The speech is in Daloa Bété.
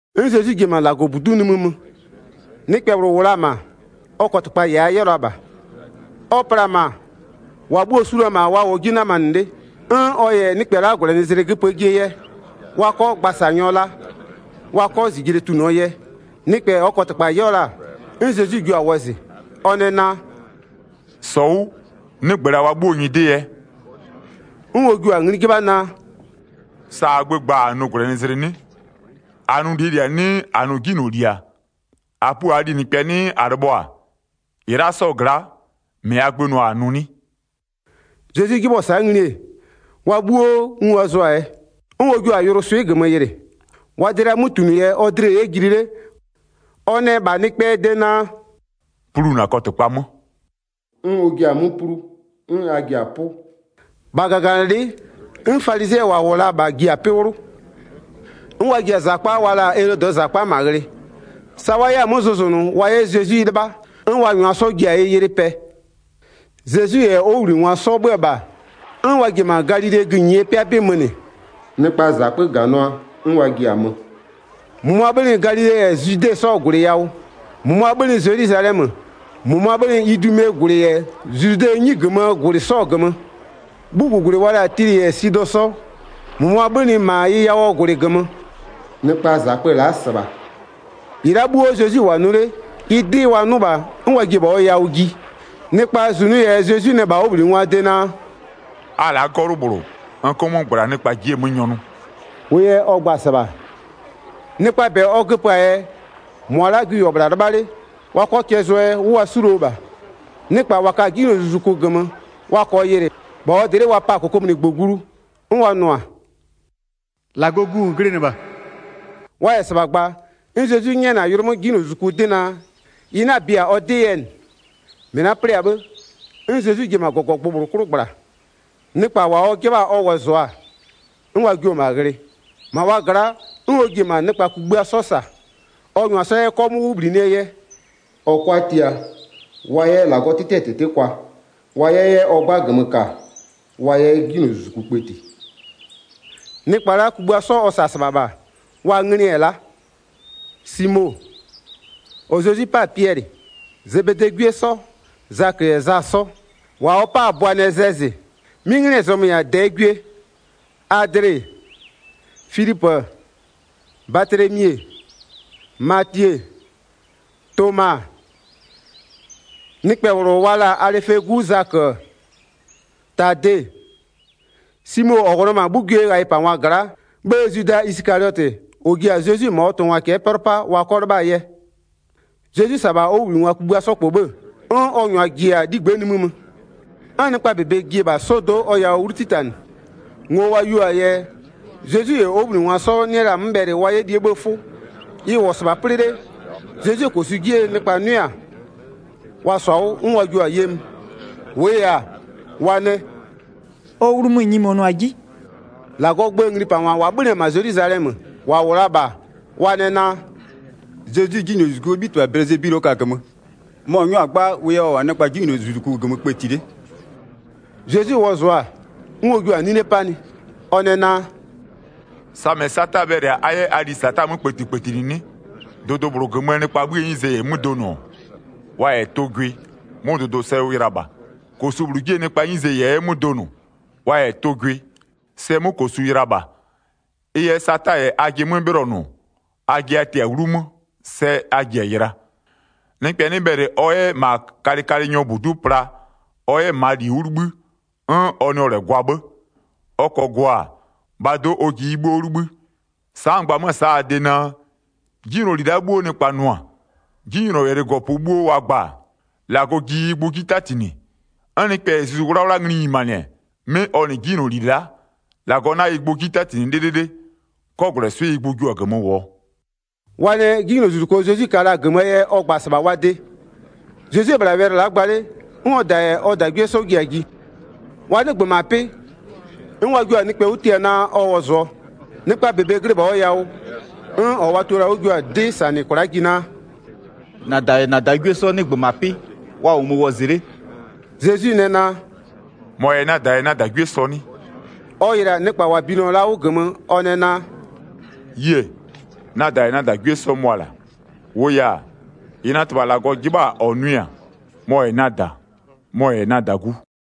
'N Zezwi ji-e -ma -Lagɔbudu'u nimï mö. Nɩkpɛ -bhlʋ -wʋ la-a -ma, ɔ kɔtɩkpa -yɛ a 'yɛɔ la -bha. Ɔ pla-a -ma, -wa bhuo-o su la-a -ma wa -wʋɔ 'ji 'namanɩ 'le, 'n ɔ -yɛ nɩkpɛ la'a -gwlɛnɩzlɩ göpöö jie yɛ, wa 'kɔ gbasanyɔ la, wa 'kɔ -zijle tunʋɔ yɛ. Nɩkpɛ -ɔɔ kɔtɩkpa 'yɛɔ la-a, 'n Zezwi jio-a wɔzɩ. Ɔ nɛ naa: “-Sɔ 'wʋ, 'nɩgbö -la wa 'bhuoo nyɩdɩ yɛ.” 'N ɔ jua-a ngli 'jɩbha naa: “Sa -aa gbö gba-a -a nʋ -gwlɛnɩzlɩ 'nɩ? -A nʋ -lie -li-a 'nɩɩ -a nʋ 'jinyloli-a? -A pua -aa linɩkpɛ 'nɩɩ -a lɩbhɔ-a? -Ɩ la'a 'sɔɔ gla'a, -mɩ -aa gbö nʋ-a -a nʋ 'nɩ?” Zezwi 'jɩbhʋa-a sa'a ngli-e, wa 'bhuo ngu wa zʋ-a yɛ. 'N ɔ jua-a yʋlʋswɩ'ɩ -gömö yɩlɩ. Wa dlɩa 'mötunʋ yɛ ɔ dlɩ-ɛ 'yɛ jili 'le, ɔ nɛ -bha nɩkpɛɛ de naa: “Plu -na kɔtɩkpa 'mö.” 'N ɔ jia-a 'mö plu, 'n a ji-a 'pʋ. 6-Bha -gaganɩlɩ'ɩ, 'n falizɩɛ -wa -wʋ la-a -bha ji-a 'pɩ 'wlʋ, 'n wa ji-a -zakpa wa la-a Elodɩɛ -zakpa -ma ghlɩ, sa wa 'yɛ-a 'mö zʋzʋnʋ wa 'yɛ Zezwi 'lɩbha, 'n wa -nyʋa 'sɔ ji-a ɩ ylɩ pɛ. Zezwi -yɛ ɔ 'wʋbhlinɩngwa 'sɔ 'bhö-ö -bha, 'n wa ji-e -ma Galilee gïnyie 'pɩa 'bɩ mönɩ. Nɩkpaa -zakpö -ganʋa, 'n wa ji-a mö. 8-Mʋmʋa 'bhönɩ Galile -yɛ Zwide 'sɔɔ -gwlɩ yawʋ, -mʋmʋa 'bhönɩ Zelwizalɛmö, -mʋmʋa 'bhönɩ Idumee -gwlɩ -yɛ Zludɛɛ 'nyi -gömöö -gwlɩ 'sɔɔ -gömö, 'bhugugwlɩ wa la-a Tilɩ -yɛ Sidɔ 'sɔ, -mʋmʋa 'bhönɩ -ma ɩ yawʋɔ -gwlɩ -gömö. Nɩkpaa -zakpö la'a -sɩbha, -ɩ la'a 'bhuo Zezwi -wʋ-a nʋ 'le, ɩ 'dɩ wa 'nʋ -bha, 'n wa ji-e -bha ɔ yawʋ ji. Nɩkpaa -zunʋ yɛ Zezwi nɛ -bha ɔ 'wʋbhlinɩngwaa de naa: “A la'a 'gɔlʋ -bhlʋ, n 'kʋ 'mö -gbla nɩkpa ji'i-e 'mö nyɔnʋ.” 10-Wʋʋ yɛ ɔ gba-a -sɩbha, nɩkpaa -bɛ ɔ göpö-aa yɛ, -mʋa la'a gwi -wʋ-ɔ -bhla 'lɩbha 'le, wa 'kɔ cɛ zʋɔ yɛ 'wʋ wa 'suluo -bha. Nɩkpa -wa ka-a 'jinylozuzuku -gömö wa -kɔɔ yɩlɩ -bha ɔ dlɩ'ɩ wa pa-a -kokomunigbö glu, 'n wa nʋ-a: “-Lagɔɔ Gu -n glɩnɩ -bha.” Wa -yɛ -sɩbha gba-a, 'n Zezwi 'nyɛnɩ-a yʋlʋ 'mö 'jinylozuzuku 'dɩ naa, ɩ 'na-a bia ɔ 'dɩ yɛ -nɩ. Zezwi yɛ ɔ tiatiangwa kugbïa 'sɔ -bha -sa 13-Mɩ la'a 'plɩ-a 'bhë, 'n Zezwi ji-e -ma -gɔgɔgbʋ -bhlʋ 'klʋ -gbla. Nɩkpa -wa ɔ 'jɩbha-a ɔ wɔzʋa-a, 'n wa jio-o -ma ghlɩ. 14-Ma wa gla'a 'n ɔ ji-e -ma nɩkpa kugbïa 'sɔ -sa ɔ -nyʋa 'sɔ 'yɛ 'kɔmʋʋ 'wʋ -bhlinɩɛ yɛ, ɔ 'kʋa tia, wa 'yɛ -Lagɔɔ 'tɩtɩɛ -tɩtɩ kwa, wa 'yɛ 'yɛ ɔ 'gba -gömö -ka wa 'yɛ 'jinylozuzuku kpëti. Nɩkpa la'a kugbïa 'sɔ ɔ -sa-a -sɩbha -bha wa nglɩ-ɛ la'a: Simo, -ɔ Zezwi 'pa-a Piɛlɩ. Zebedee 'gwie 'sɔ, Zakö -yɛ Za 'sɔ, -wa ɔ 'pa-a Bʋanɛzɛzɩ, 'mɩ 'nglɩɛ zɔmö-ö -yɛ-a -dɛɛ gwie. Adle-e, Filipö-ö, Batlemi-e, Matie-e, Toma-a, nɩkpɛ -bhlʋ wa la-a Alɩfee 'gu Zakö-ö, Tade-e, Simo -ɔ -wʋ la-a -ma 'bhugwiee ghayɩpangwa gla'a, 'bhë Zwida Isɩkaliɔtɩ, -ɔ ji-a Zezwi -ma ɔ tʋngwa cɛ'ɛ 'pɛlʋ 'paa wa 'kɔ 'lɩbhaa yɛ. Zezwi -sa-a -bha ɔ 'wʋbhlinɩngwa kugbïa 'sɔ -kpɔ, 'n ɔ -nyʋa ji-a 'ligbë'ë nimï mö. 'N nɩkpa -bebe ji-e -bha 'sɔdo'o ɔ yawʋ 'wlu 'titanɩ. Ngo wa yeo-aa yɛ, Zezwi -yɛ ɔ 'wʋbhlinɩngwa 'sɔ 'nɩ la-a 'mö bhɛlɩ wa 'yɛ lie 'bhëë 'fʋ. Ɩ -wʋ-ɔ -sɩbha 'plɩ 'le, Zezwie -kosu 'jie nɩkpa 'nʋɩ-a, wa -sɔ-a 'wʋ, 'n wa jio-a ye mö. -Wʋʋ yɛ-a, wa nɛ: “Ɔ 'wlu mö-ö nyimonʋ-a 'ji.” Zezwi yɛ -Lagɔɔ gböö nglipangwaa wɛlɩ -gömö -sa 22-Lagɔɔ gböö nglipangwa -wa 'bhönɩ-ɛ -ma Zelwizalɛmö, -wa -wʋ la-a -bha, wa nɛ naa: “Zezwi 'jinylozuzukuo 'bhitɩbha Bɛlɩzebulɩ ɔ ka-a -gömö, mɔ-ɔ 'nyɔ-a 'gba wʋ yɛ ɔ -wʋ-a nɩkpa 'jinylozuzuku -gömö kpëti 'le.” Zezwi wɔzʋa-a, 'n ɔ jua-a 'nine 'panɩ, ɔ nɛ naa: “Samɩ Sata bhɛlɩ-a a 'yɛ a lisata 'mö kpëtikpëtinɩ 'nɩ? Dʋdʋ -bhlʋ -gömöö nɩkpaa 'bhïë 'nyize -yɛ 'mö donʋ, wa -yɛ tʋ gwɩ, 'mʋ dʋdʋ sɛ ʋ yɩla -bha. 25-Kosu -bhlʋ 'jie nɩkpaa 'nyize -yɛ 'yɛ 'mö donʋ, wa -yɛ tʋ gwɩ, sɛ 'mʋ -kosu yɩla -bha. Ɩ yɛ Sata -yɛ ajɩ 'mö 'bhɩlɔnʋ, ajɩ a tɩ-a 'wlumö, sɛ a ji-a yɩla. Nɩkpɛ 'nɩ bhɛlɩ ɔ 'yɛ -ma kalɩkalɩnyɔɔ -budu'u pla ɔ 'yɛ -maa -li 'wʋ 'libhï, 'n ɔ nɩɔ -lɛ gwa 'bhë. Ɔ -kɔɔ gwa-a, -bhaa do'o, ɔ ji ɩ 'bhuo 'wʋ 'libhï. Sa'a n gba 'mö-ö sa'a a de naa: 'Jinyloli la'a 'bhuo nɩkpa nʋ-a, 'jinylɔwɛlɩɛ -gɔpö 'bhuo wa gba-a, -Lagɔ ji ɩ gbʋ 'ji 'tatinɩ. 'N nɩkpɛ -yɛ Zuzu 'Wlawla ngli nyimanɩ, 'mɩ ɔ -nɩ 'jinyloli la'a, -Lagɔ 'na ɩ gbʋ 'ji 'tatinɩ 'lɩlɩlɩ, 'kɔgwlɛswɩ'ɩ ɩ gbʋ jio-a -gömö -wʋɔ.” Wa nɛ 'jinylozuzuko Zezwi ka la-a -gömöö yɛ ɔ gba-a -sɩbha wa de. Zezwi-e -bhla wɛlɩ la'a gba 'le, 'n ɔ -da -yɛ ɔ -dagwie 'sɔ ji-a ji. Wa 'nɩgbö -ma 'pɩ, 'n wa jio-a nɩkpɛ 'wʋ tia naa, ɔ wɔzɩɔ. Nɩkpaa -bebe glɩ -bha ɔ yawʋ, 'n -ɔ wa tio la-a 'wʋ jio-a 'dɩ -sanɩ kwla'a ji naa: “-Na -da -yɛ -na -dagwie 'sɔ 'nɩgbö -ma 'pɩ, wa -wʋmö wɔzɩ 'le.” Zezwi nɛ naa: “-Mɔ -yɛ-a na -da -yɛ na -dagwie sɔ 'nɩ?” Ɔ yɩlɩ-a nɩkpa -wa binɩɔ la-a 'wʋ -gömö, ɔ nɛ naa: “A yie! Na -da -yɛ na -dagwie 'sɔ mʋa-a la'a. 35-Wʋʋ yɛ-a, -ɩ na -Tɩbha -Lagɔ 'jɩbha-a -ɔ nʋɩ-a, mɔ-ɔ -yɛ-a na -da, mɔ-ɔ -yɛ-a na -dagu.”